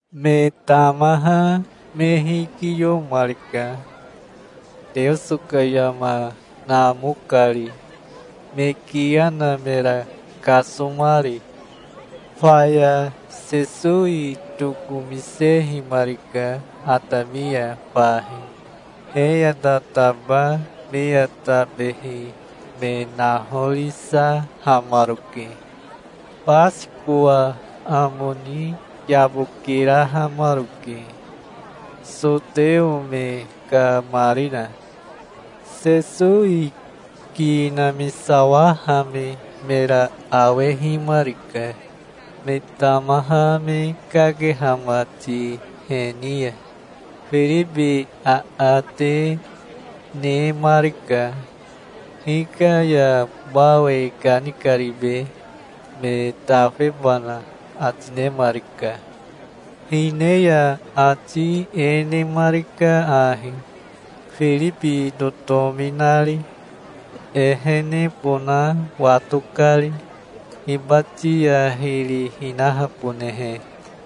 Me tamaha me hikiyomarika, Teoso ka yama namo kari, me kiya na mera kasomari. Faya Sesowi tokomisehimarika atami ya fahi. He ya tataba me ya tabehi me nahorisahamaroke. Basikowa amo ni yabokirahamaroke, soteo me ka marina. Sesowi ki namisawahame mera awehimarika, me tamaha me kakeha mati he ni ya. Firibi aate nemarika. "Hika ya bao e kanikaribe, me tafebana?" ati nemarika. Hine ya ati e nemarika ahi, Firibi totomi nari, ehenebona wato kari, hibati ya hiri hinahabonehe.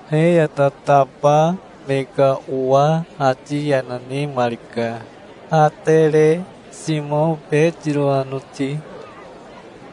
He ya tataba me ka owa ati yana nemarika, Atere, Simao Betiro anoti.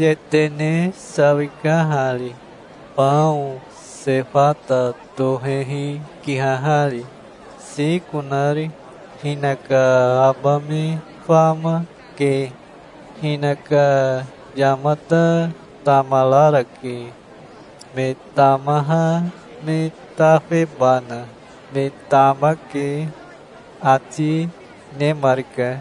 "Yetene sawika hari, bao sefata tohehi kihahari, siko nari. Hinaka aba me fama, ke. Hinaka yamata tamararake, me tamaha me tafebana. Me tamake", ati nemarika.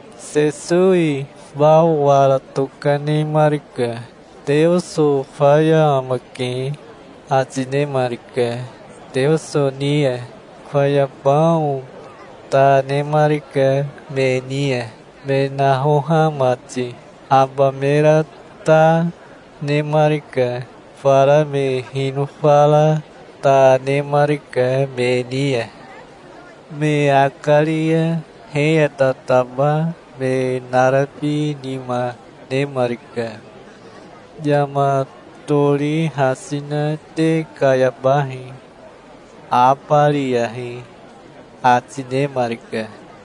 Sesowi bao wara tokanemarika. "Teoso faya amake", ati nemarika, Teoso ni ya. Faya bao ta nemarika me ni ya, me nahoha mati. Aba mera ta, nemarika. Fara me hinofa ra ta nemarika me ni ya. Me akari ya he ya tataba me narabi nima nemarika. "Yama tori hasi na te kayabahi. Abariyahi", ati nemarika.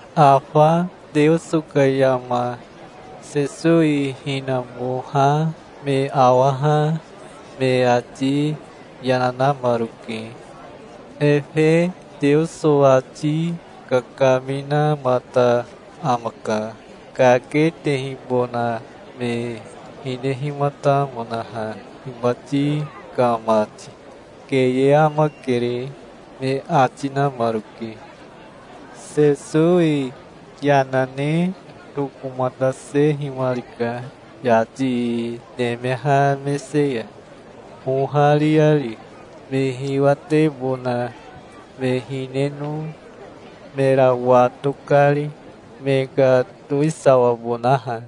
Afa Teoso ka yama Sesowi hinamoha me awaha me ati yana namaroke. "Efe Teoso ati kakaminamata amaka, kaketehibona me hinehimatamonaha hibati ka mati. Keye amakere", me ati namaroke. Sesowi yana ne tokomatasehimarika yati nemeha mese ya, ohariari, me hiwatebona me hineno mera wato kari, me ka towisawabonaha.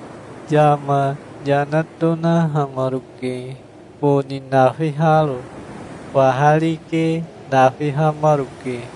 Yama yana tonahamaroke, boni nafiharo. Faha rike nafihamaroke.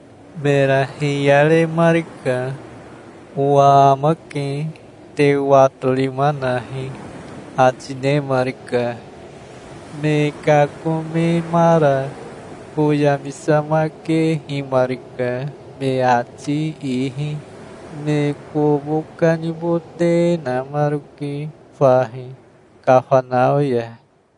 Mera hiyaremarika. "Owa amake. Te watorima nahi", ati nemarika. Me kakomemara foyamisamakehimarika me ati ihi. Me kobo kanibote namaroke fahi Kafanao ya.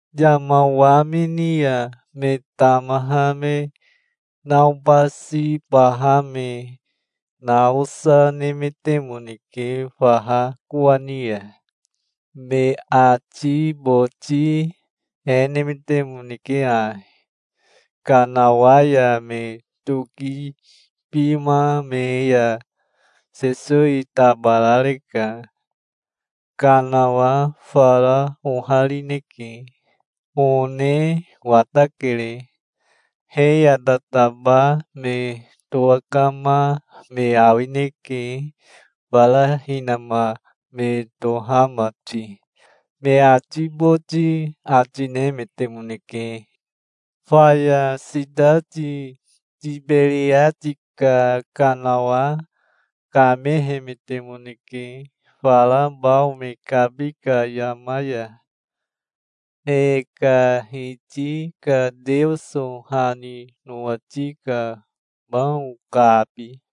Yama wamini ya me tamaha me naobasibaha me naosa nemetemoneke faha kowani ya. Me ati boti e nemetemoneke ahi: "Kanawa ya me tokibima me ya Sesowi tabarareka. Kanawa fara oharineke. One watakere. He ya tataba me towakama me awineke fara hinama me toha mati", me ati boti ati nemetemoneke. Faya sitati Tiberiati ka kanawa kamehemetemoneke fara bao me kabi ka yama ya, e ka Hiti ka Teoso ha ni nowati ka bao kabi.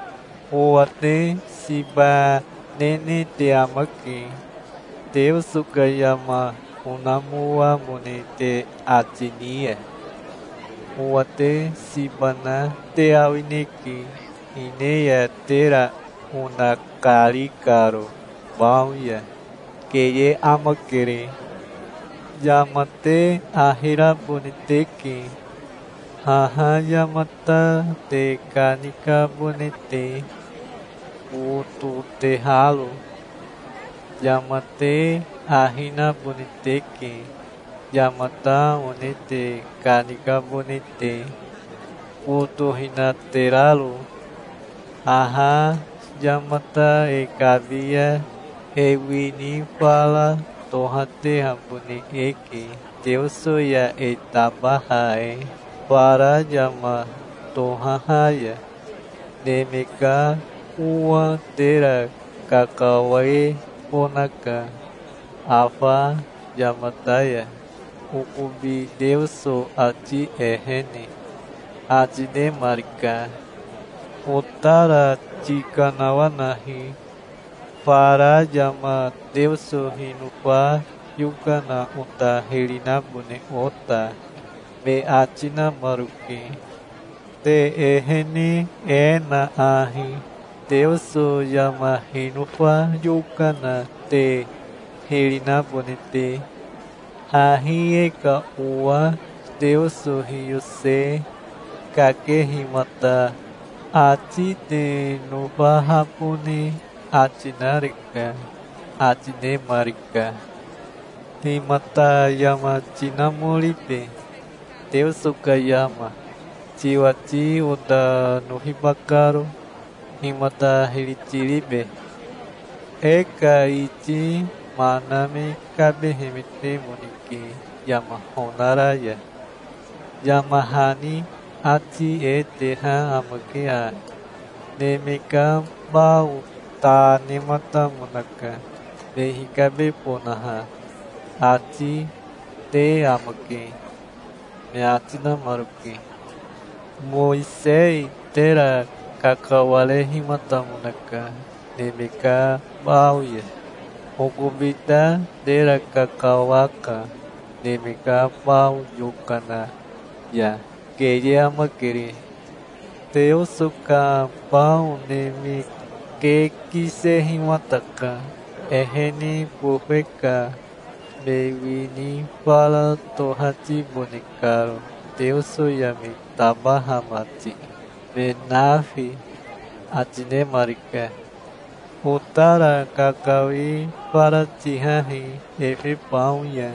"Owa te siba nene te amake, Teoso ka yama onamoamone te ati ni ya. Owa te siba na te awineke hine ya tera onakari karo bao ya. Keye amakere. Yama te ahi rabone teke, haha yamata te kanikabone te, bototeharo. Yama te ahi nabone teke, yamata one te kanikabone te, botohinateraro. Haha yamata e kabi ya e wini fara tohatehabone eke Teoso ya e tabaha e, fara yama tohaha ya. Neme ka Owa tera kakawebonaka afa yamata ya, okobi Teoso ati ehene", ati nemarika. "Otara tikanawanahi, fara yama Teoso hinofa yokana ota hiri nabone ota", me ati namaroke. "Te ehene e na ahi, Teoso yama hinofa yokana te hiri nabone te. Hahi e ka owa Teoso hiyose kakehimata ati te nofahabone ati nareka", ati nemarika. "Himata yama tinamoribe, Teoso ka yama, tiwati ota nofiba karo? Himata hiri tiribe? E ka iti mana me kabehemetemoneke yama honara ya. Yama hani ati e teha amake ahi: 'Neme ka bao ta nematamonaka, me hikabebonaha', ati te amake", me ati namaroke. "Mowisei tera kakawarehimatamonaka neme ka bao ya. Okobi ta tera kakawaka neme ka bao yokana ya. Keye amakere. Teoso ka bao neme ke kisehimataka, ehene bofe ka me wini fara tohatibone karo Teoso ya me tabaha mati, me nafi", ati nemarika. "Otara kakawi fara tihahi efe bao ya",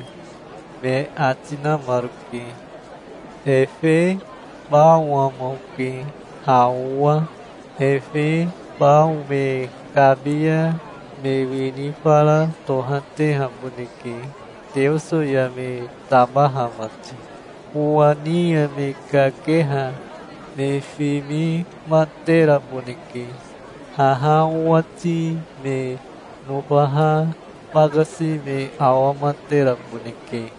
me ati namaroke. "Efe bao ama oke, ha owa. Efe bao me kabi ya me wini fara tohatehaboneke Teoso ya me tabaha mati. Owa ni ya me kakeha me fimimateraboneke. Haha owati me nofaha bakasi me awamateraboneke.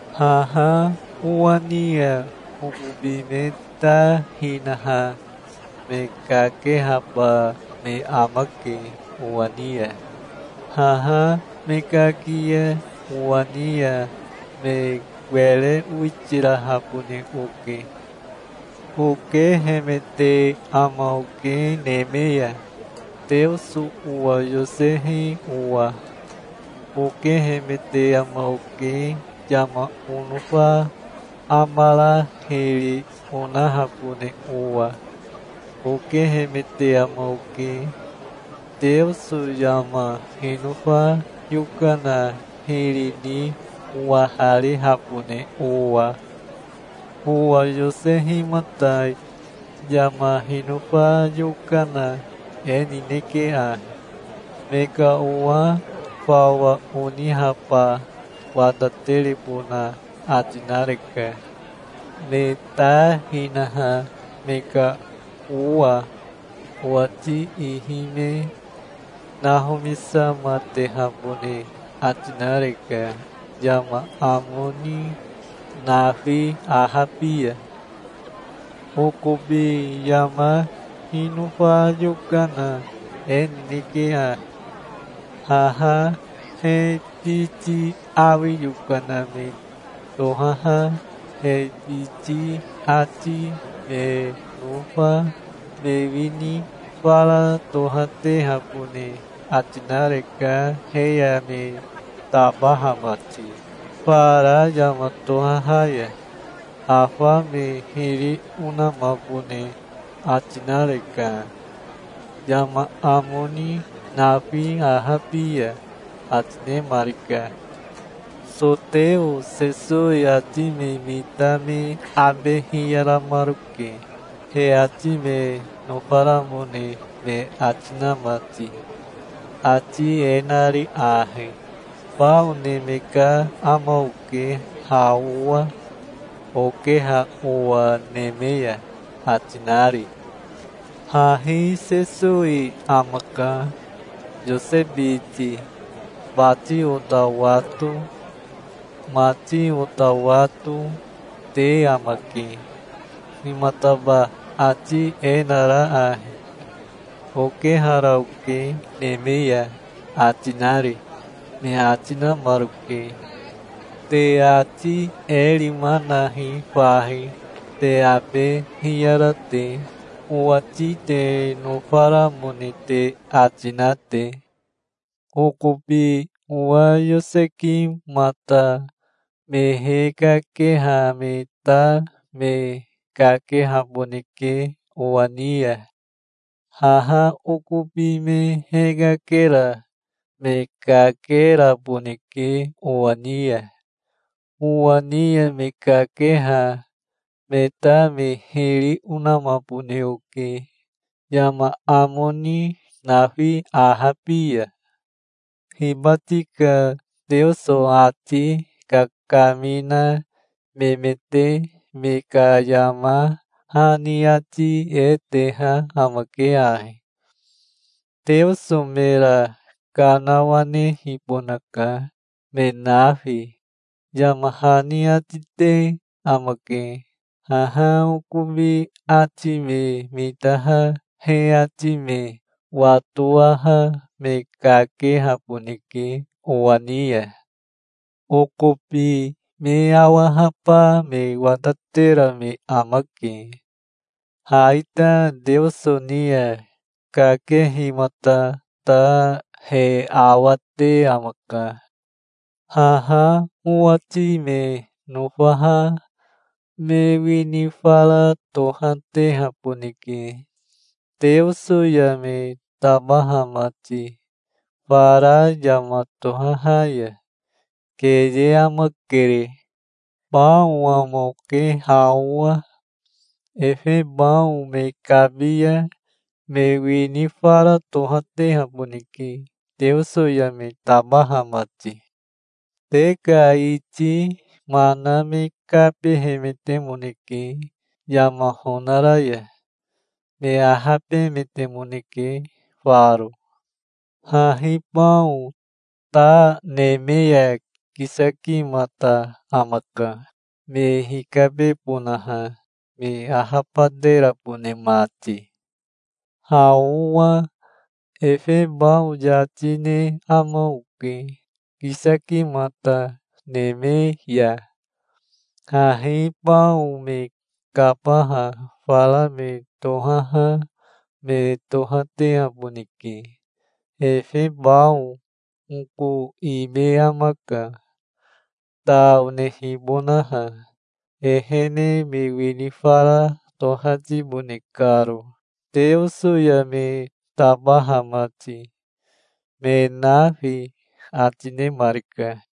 Haha owa ni ya okobi me ta hinaha me kakehaba me amake owa ni ya. Haha me kaki ya owa ni ya me were owitirahabone oke. Okehemete ama oke neme ya, Teoso owa yosehi owa. Okehemete ama oke yama onofa amara hiri onahabone owa. Okehemete ama oke, Teoso yama hinofa yokana hiri ni owaharihabone owa. Owa yosehimata yama hinofa yokana e nineke ahi. Me ka owa fawa oniheba wataterebona ati nareka, me ta hinaha me ka owa. Owati ihi me nahomisamatehabone ati nareka yama amo ni nafi ahabi ya. Okobi yama hinofa yokana e nineke ahi: Haha he biti awi yokana me tohaha he biti ati me nofa me wini fara tohatehabone ati nareka he ya me tabaha mati, fara yama tohaha ya. Afa me hiri onamabone ati nareka, yama amo ni nafi ahabi ya", ati nemarika. Soteo Sesowi ati me mita me abe hiyaramaroke, he ati me nofaramone me ati na mati, ati e nari ahi, "Bao neme ka ama oke ha owa, okeha owa neme ya", ati nari. "Hahi Sesowi amaka, Yose biti. Bati ota wato, mati ota wato, te amake. Himataba ati e nara ahi: 'Okehara oke neme ya', ati nari?" me ati namaroke. "Te ati e rima nahi fahi, te abe hiyara te, owati te nofaramone te ati na te. Okobi owa yosekimata me hekakeha me ta me kakehaboneke owa ni ya. Haha okobi me hekakera me kakeraboneke owa ni ya. Owa ni ya me kakeha me ta me hiri onamabone oke, yama amo ni nafi ahabi ya. Hibati ka Teoso ati kakamina memete me ka yama hani ati e teha amake ahi: 'Teoso mera kanawanehibonaka, me nafi', yama hani ati te amake. Haha okobi ati me mitaha he ati me watowaha me kakehaboneke owa ni ya. Okobi me awahaba me watatera me amake. Ha ita Teoso ni ya kakehimata ta he awate amaka. Haha owati me nofaha me wini fara tohatehaboneke Teoso ya me tabaha mati, fara yama tohaha ya. Keye amakere. Bao ama oke ha owa. Efe bao me kabi ya me wini fara tohatehaboneke Teoso ya me tabaha mati. Te ka iti mana me kabehemetemoneke yama honara ya. Me ahabemetemoneke faro. Hahi bao ta neme ya kisakimata amaka, me hikabebonaha, me ahabaterabone mati. Ha owa efe bao yati ne ama oke, kisakimata neme ya. Hahi bao me kabaha fara me tohaha me tohatehaboneke. Efe bao oko ime amaka, ta onehibonaha, ehene me wini fara tohatibone karo Teoso ya me tabaha mati, me nafi", ati nemarika.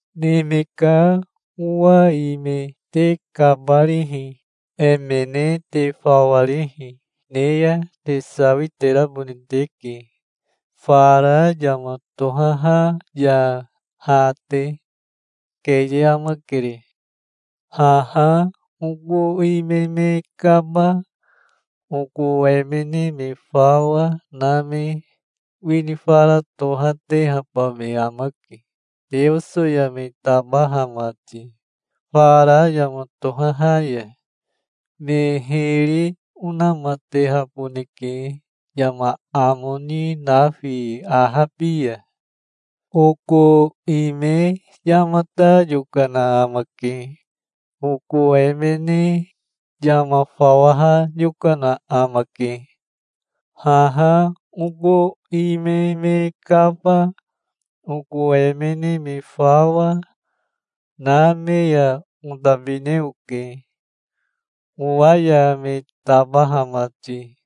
"Neme ka Owa ime te kabarihi, emene te fawarihi ne ya te sawiterabone teke fara yama tohaha ya ha te. Keye amakere. Haha oko ime me kaba, oko emene me fawa na me wini fara tohatehaba me amake Teoso ya me tabaha mati, fara yama tohaha ya. Me hiri onamatehaboneke yama amo ni nafi ahabi ya. Oko ime yamata yokana amake. Oko emene yama fawaha yokana amake. Haha oko ime me kaba, oko emene me fawa, na me ya otabine oke, owa ya me tabaha mati.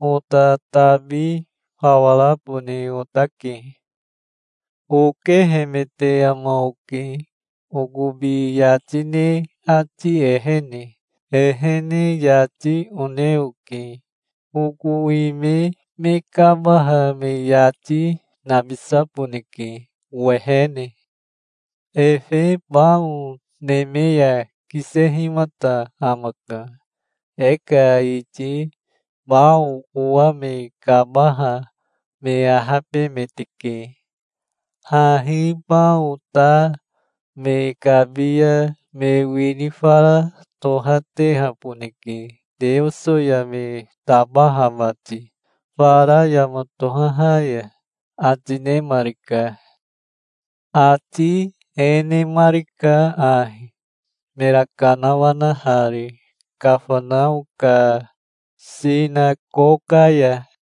Ota tabi fawa rabone otake. Okehemete ama oke okobi yati ne ati ehene. Ehene yati one oke. Oko ime me kabaha me yati nabisaboneke owehene. Efe bao neme ya kisehimata amaka. E ka iti bao owa me kabaha me ahabemeteke. Hahi bao ta me kabi ya me wini fara tohatehaboneke Teoso ya me tabaha mati fara yama tohaha ya", ati nemarika. Ati e nemarika ahi, mera kanawanahari Kafanao ka sinakoka ya.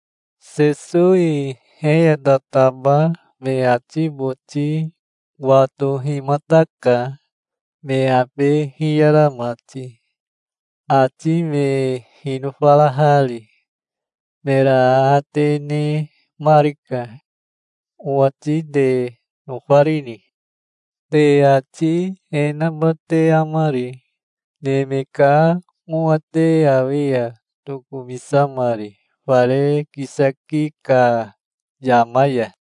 Sesowi he ya tataba me ati boti watohimataka, me abe hiyara mati, ati me hinofarahari. Mera aate nemarika. "Owati te nofarini? Te ati e naba te amari, Neme ka Owa te awi ya tokomisamari fare kisaki ka yama ya?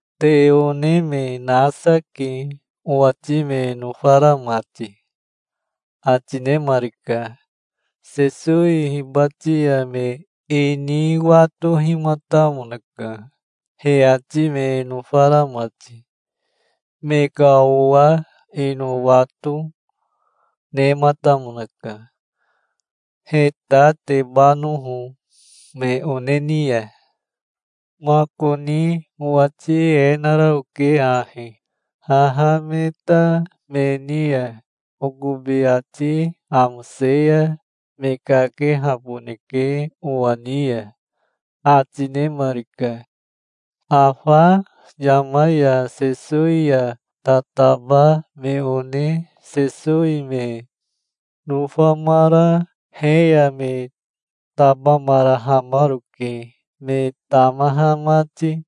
Te one me nasa ke owati me nofara mati", ati nemarika. Sesowi hibati ya me ini watohimatamonaka, he ati me nofara mati. Me ka owa ino wato, nematamonaka, he ta tebanoho me one ni ya. "Makoni owati e nara oke ahi: 'Haha me ta me ni ya okobi ati amose ya me kakehaboneke owa ni ya'", ati nemarika. Afa yama ya Sesowi ya tataba me one Sesowi me nofamara he ya me tabamarahamaroke, me tamaha mati.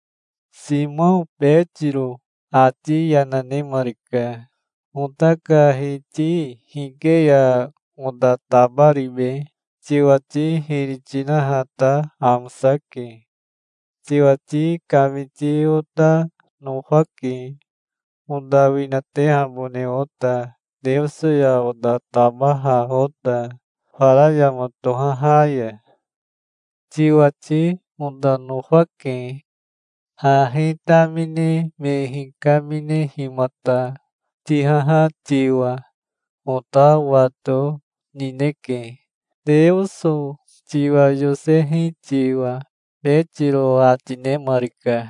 Simao Betiro ati yana nemarika. "Ota ka Hiti hike ya ota tabaribe? Tiwati hiri tinaha ta amosake. Tiwati kamiti ota nofake, ota winatehabone ota Teoso ya ota tabaha ota, fara yama tohaha ya. Tiwati ota nofake. Hahi tamine me hikaminehimata tihaha tiwa ota wato nineke, Teoso tiwa yosehi tiwa", Betiro ati nemarika.